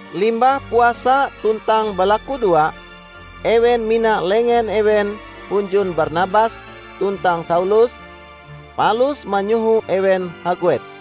Limbah puasa tuntang balakudoa ewen mina lengen ewen hunjun Barnabas tuntang Saulus palus manyoho ewen haguet.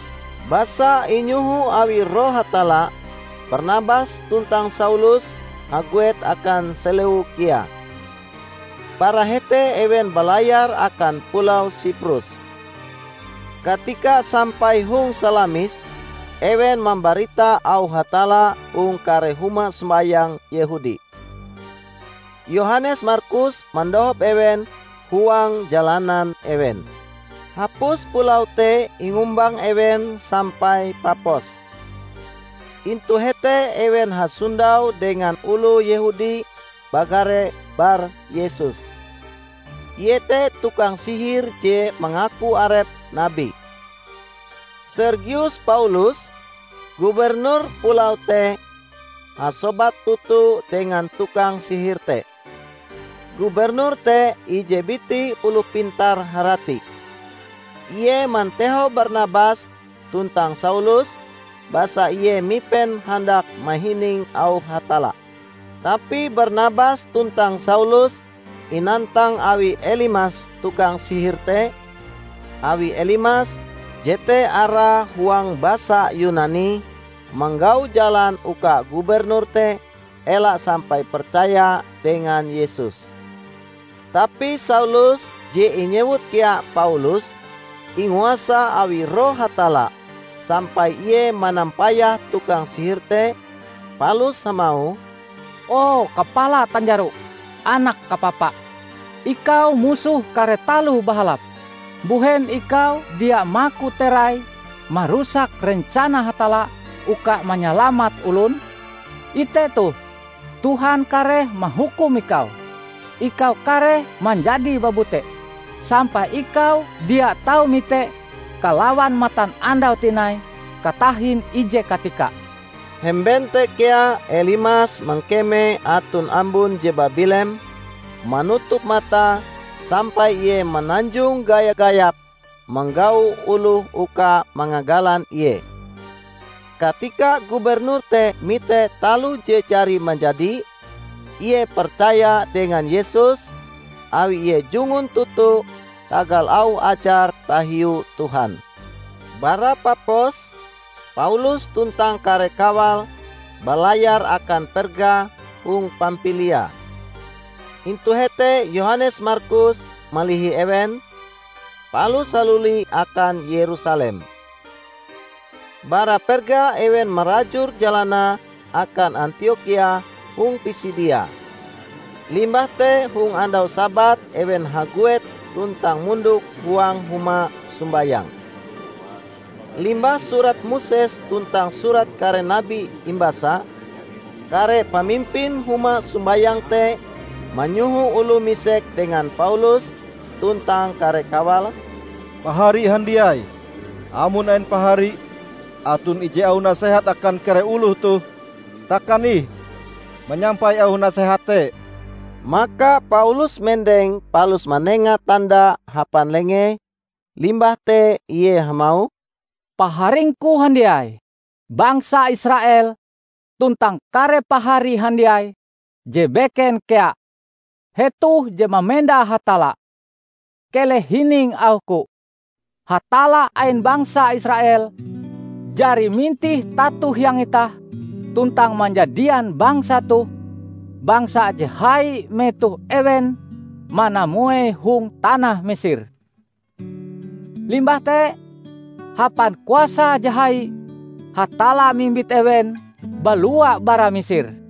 Basa inyoho awi Roh Hatalla, Barnabas tuntang Saulus haguet akan Seleukia. Bara hete ewen balayar akan pulau Siprus. Katika sampai hong Salamis, ewen mambarita auh Hatalla hong kare huma sombayang Yehudi. Yohanes Markus mandohop ewen huang jalanan ewen. Hapus pulau te ingumbang ewen sampai Papos. Intu hete ewen hasondau dengan oloh Yehudi bagare Bar Yesus. Ie te tukang sihir je mangaku arepe nabi. Sergius Paulus, gubernur pulau te hasobat toto dengan tukang sihir te. Gubernur te ije biti oloh pintar harati. Ie mantehau Barnabas tuntang Saulus basa ie mipen handak mahining auh Hatalla. Tapi Barnabas tuntang Saulus inantang awi Elimas tukang sihir te, awi Elimas (Jete arae huang basa Yunani) manggau jalan uka gubernur te ela sampai percaya dengan Yesus. Tapi Saulus -- je inyewut kea Paulus -- inguasa awi Roh Hatalla, sampai ie manampayah tukang sihir te, palus hamauh, "O kapala tanjaro, anak kapapa! Ikau musoh kare taloh bahalap. Mbuhen ikau dia maku terai marusak rencana Hatalla uka manyalamat olon? Ite toh, Tuhan kareh mahukum ikau! Ikau kareh manjadi babute, sampai ikau dia tau mite kalawan matanandau tinai katahin ije katika." Hemben te kea Elimas mangkeme aton ambun je babilem manutup matae sampai ie mananjong gaya-gayap manggau oloh uka mangagalan ie. Katika gubernur te mite taloh je jari manjadi, ie percaya dengan Yesus; awi ie jungun toto tagal auh ajar tahiu Tuhan. Bara Papos, Paulus tuntang kare kawale balayar akan Perga hong Pampilia. Intu hete Yohanes Markus malihi ewen, palus haluli akan Yerusalem. Bara Perga ewen marajur jalanae akan Antiokhia hong Pisidia, limbah te hong andau Sabat ewen haguet tuntang mondok huang huma sombayang. Limbah Surat Moses tuntang Surat Kare Nabi imbasa, kare pamimpin huma sombayang te manyoho oloh misek dengan Paulus tuntang kare kawale, "Pahari handiai, amon ain pahari aton ije auh nasehat akan kare oloh toh, takan ih manyampai auh nasehat te." Maka Paulus mendeng palus manenga tanda hapan lengee, limbah te ie hamauh, "Paharingku handiai bangsa Israel tuntang kare pahari handiai je beken kea hetoh je mamenda Hatalla! Keleh hining auhku: Hatalla ain bangsa Israel jari mintih tato hiang itah, tuntang manjadian bangsa toh bangsa je hai metoh ewen manamuei hong tanah Misir. Limbah te, hapan kuasae je hai, Hatalla mimbit ewen balua bara Misir.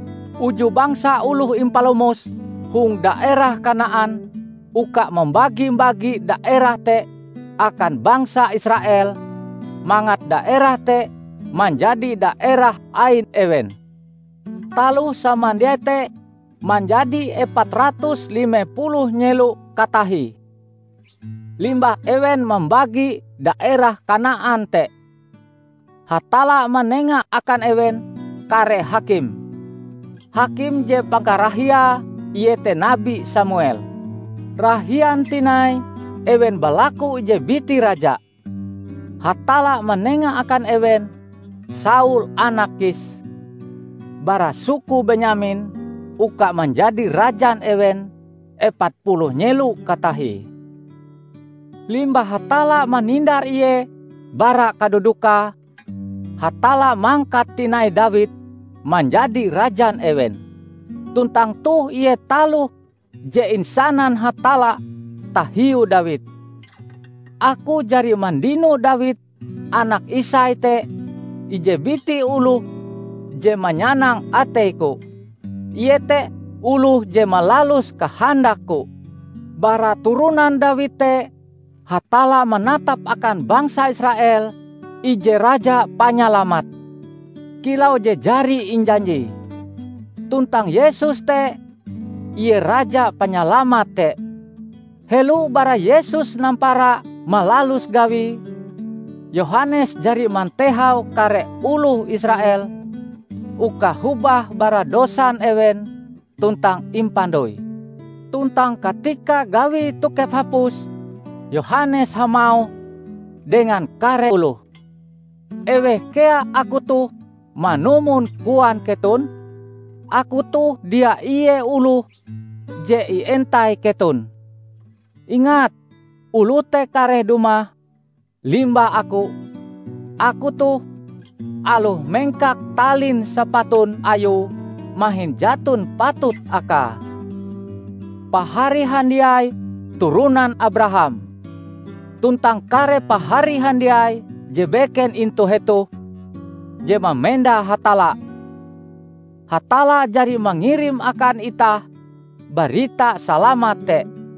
Uju bangsa oloh impalomose hong daerah Kanaan uka mambagi-bagi daerah te akan bangsa Israel mangat daerah te manjadi daerah ain ewen. Taloh samandiai te manjadi epat ratus lime puluh nyelo katahie. Limbah ewen mambagi daerah Kanaan te, Hatalla manenga akan ewen kare hakim. Hakim je pangkarahiae iete nabi Samuel. Rahian tinai ewen balaku ije biti raja. Hatalla manenga akan ewen Saul anak Kis bara suku Benyamin uka manjadi rajan ewen epat puluh nyelo katahie. Limbah Hatalla manindar ie bara kadudukae, Hatalla mangkat tinai Dawid manjadi rajan ewen. Tuntang toh ie taloh je insanan Hatalla tahiu Dawid, 'Aku jari mandino Dawid anak Isai te ije biti oloh je manyanang atei-Ku. Ie te oloh je malalus kahandak-Ku.' Bara turonan Dawid te Hatalla manatap akan bangsa Israel ije Raja Panyalamat, kilau je jari injanjie. Tuntang Yesus te Ie Raja Panyalamat te. Helo bara Yesus nampara malalus gawie, Yohanes jari mantehau kare oloh Israel uka hobah bara dosan ewen tuntang impandoi. Tuntang katika gawie tokep hapus Yohanes hamauh dengan kare oloh, 'Eweh kea aku toh manumon koan keton? Aku toh dia ie oloh je ientai keton. Ingat oloh te kareh dumah limbah aku; aku toh, aloh mengkak talin sapatun Ayue mahin jaton patut Akae.' Pahari handiai turonan Abraham, tuntang kare pahari handiai je beken intu hetoh je mamenda Hatalla! Hatalla jari mangirim akan itah barita salamat te;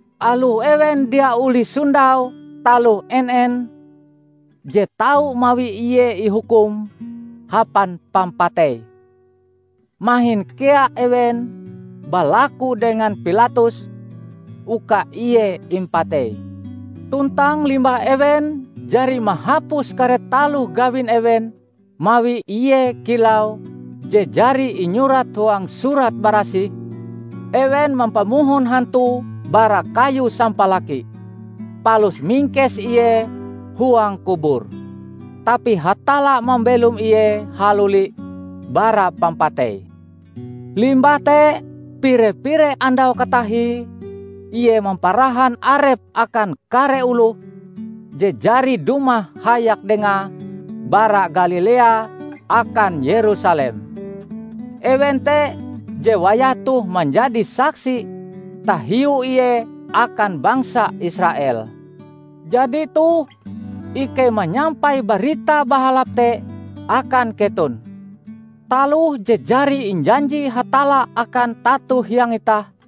Aloh ewen dia olih sondau taloh en-en je tau mawi Ie ihukum hapan pampatei, mahin kea ewen balaku dengan Pilatus uka Ie impatei. Tuntang limbah ewen jari mahapus kare taloh gawin ewen mawi Ie kilau je jari inyurat huang Surat Barasih, ewen mampamohon hantue bara kayu sampalaki, palus mingkes Ie huang kubur. Tapi Hatalla mambelom Ie haluli bara pampatei. Limbah te pire-pire andau katahie Ie mamparahan arepe akan kare oloh je jari dumah hayak dengae bara Galilea akan Yerusalem. Ewen te je wayah toh manjadi saksi tahiu Ie akan bangsa Israel. Jadi toh, ikei manyampai Barita Bahalap te akan keton: Taloh je jari injanji Hatalla akan tato-hiang itah,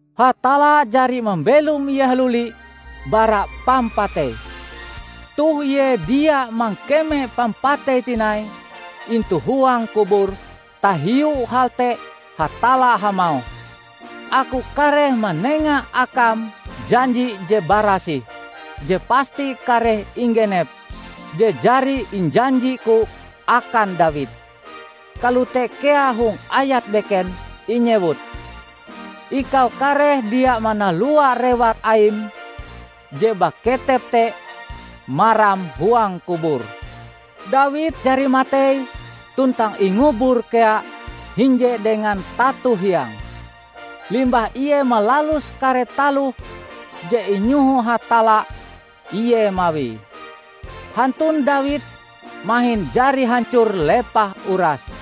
Hatalla jari mambelom Ie haluli bara pampatei. Toh Ie dia mangkeme pampatei tinai intu huang kubur, tahiu hal te Hatalla hamauh, 'Aku kareh manenga Akam janji je barasih, je pasti kareh inggenep, je jari injanji-Ku akan Dawid.' Kalote kea hong ayat beken inyewut, 'Ikau kareh dia manalua rewar Aim je baketep te maram huang kubur.' Dawid jari matei tuntang ingubur kea hinje dengan tato-hiange, limbah Ie malalus kare taloh je inyoho Hatalla Ie mawie. Hantun Dawid mahin jari hancor lepah urase.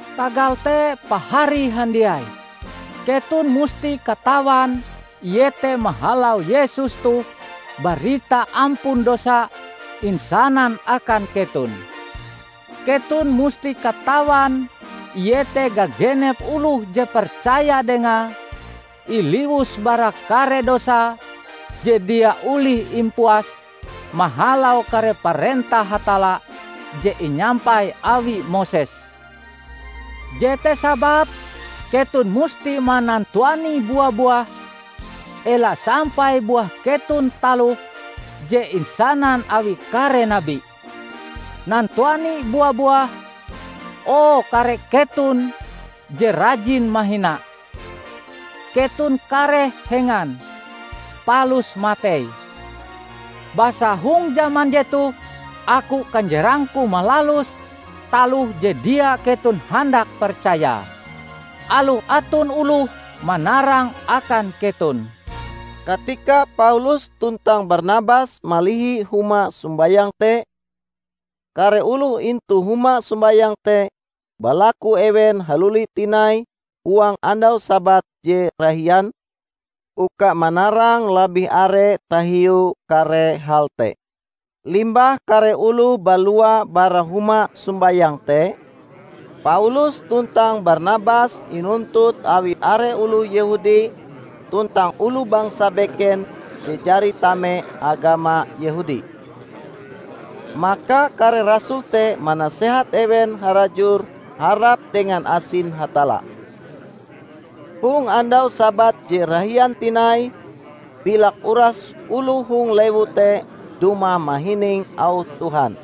Tagal te pahari handiai, keton musti katawan iete mahalau Yesus toh barita ampun dosa insanan akan keton; keton musti katawan iete gagenep oloh je percaya dengae, iliwus bara kare dosae je dia olih impuas mahalau kare parentah Hatalla je inyampai awi Moses. Jete sababe keton musti manantuani bua-buah ela sampai buah keton taloh je insanan awi kare nabi, 'Nantuani bua-buah, o kare keton je rajin mahina! Keton kareh hengan, palus matei! Basa hong jaman jetoh Aku kanjerangku malalus taloh je dia keton handak percayae, aloh aton oloh manarange akan keton.' " Katika Paulus tuntang Barnabas malihi huma sombayang te, kare oloh intu huma sombayang te balaku ewen haluli tinai huang andau Sabat je rahian, uka manarang labih are tahiu kare hal te. Limbah kare oloh balua bara huma sombayang te, Paulus tuntang Barnabas inuntut awi are oloh Yehudi tuntang oloh bangsa beken je jari tame agama Yehudi. Maka kare rasul te manasehat ewen harajur harap dengan asin Hatalla. Hong andau Sabat je rahian tinai, bilak uras oloh hong lewu te dumah mahining auh Tuhan.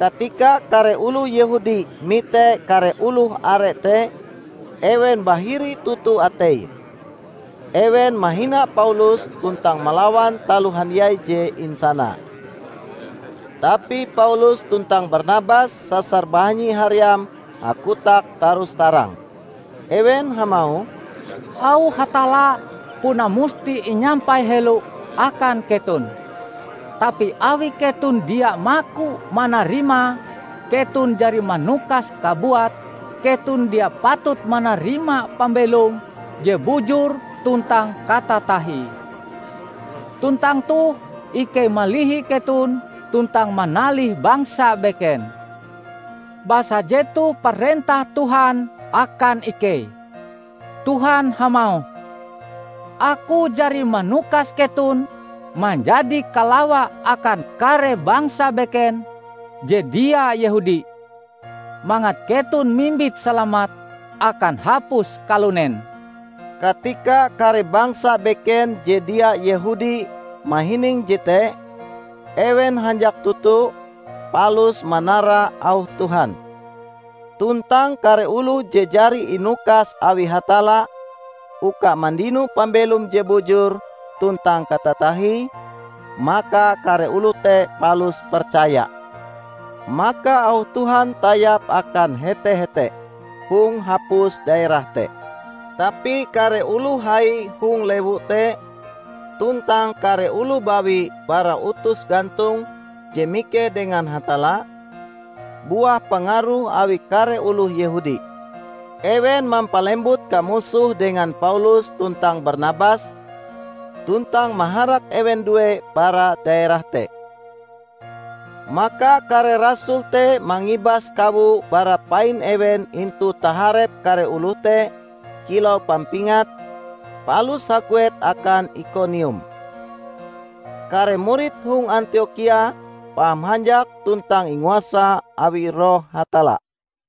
Katika kare oloh Yehudi mite kare oloh are te, ewen bahiri toto ateie. Ewen mahina Paulus tuntang malawan taloh handiai je insanae. Tapi Paulus tuntang Barnabas sasar bahanyi haream hakotak tarus-tarang. Ewen hamauh, "Auh Hatalla puna musti inyampai helo akan keton. Tapi awi keton dia maku manarimae, keton jari manukas kabuat keton dia patut manarima pambelom je bujur tuntang katatahie. Tuntang toh ikei malihi keton tuntang manalih bangsa beken. Basa jetoh parentah Tuhan akan ikei; Tuhan hamauh, 'Aku jari manukas keton manjadi kalawa akan kare bangsa beken je dia Yehudi, mangat keton mimbit salamat akan hapus kalunen.' " Katika kare bangsa beken je dia Yehudi mahining jete, ewen hanjak toto, palus manara auh Tuhan. Tuntang kare oloh je jari inukas awi Hatalla uka mandino pambelom je bujur tuntang katatahie, maka kare oloh te palus percaya. Maka auh Tuhan tayap akan hete-hete hong hapus daerah te. Tapi kare oloh hai hong lewu te tuntang kare oloh bawi bara utus gantong je mikeh dengan Hatalla, buah pangaruh awi kare oloh Yehudi. Ewen mampalembut kamusoh dengan Paulus tuntang Barnabas, tuntang maharak ewen due bara daerah te. Maka kare rasul te mangibas kawo bara pain ewen intu taharep kare oloh te kilau pampingat, palus haguet akan Ikonium. Kare murid hong Antiokhia paham hanjak tuntang inguasa awi Roh Hatalla.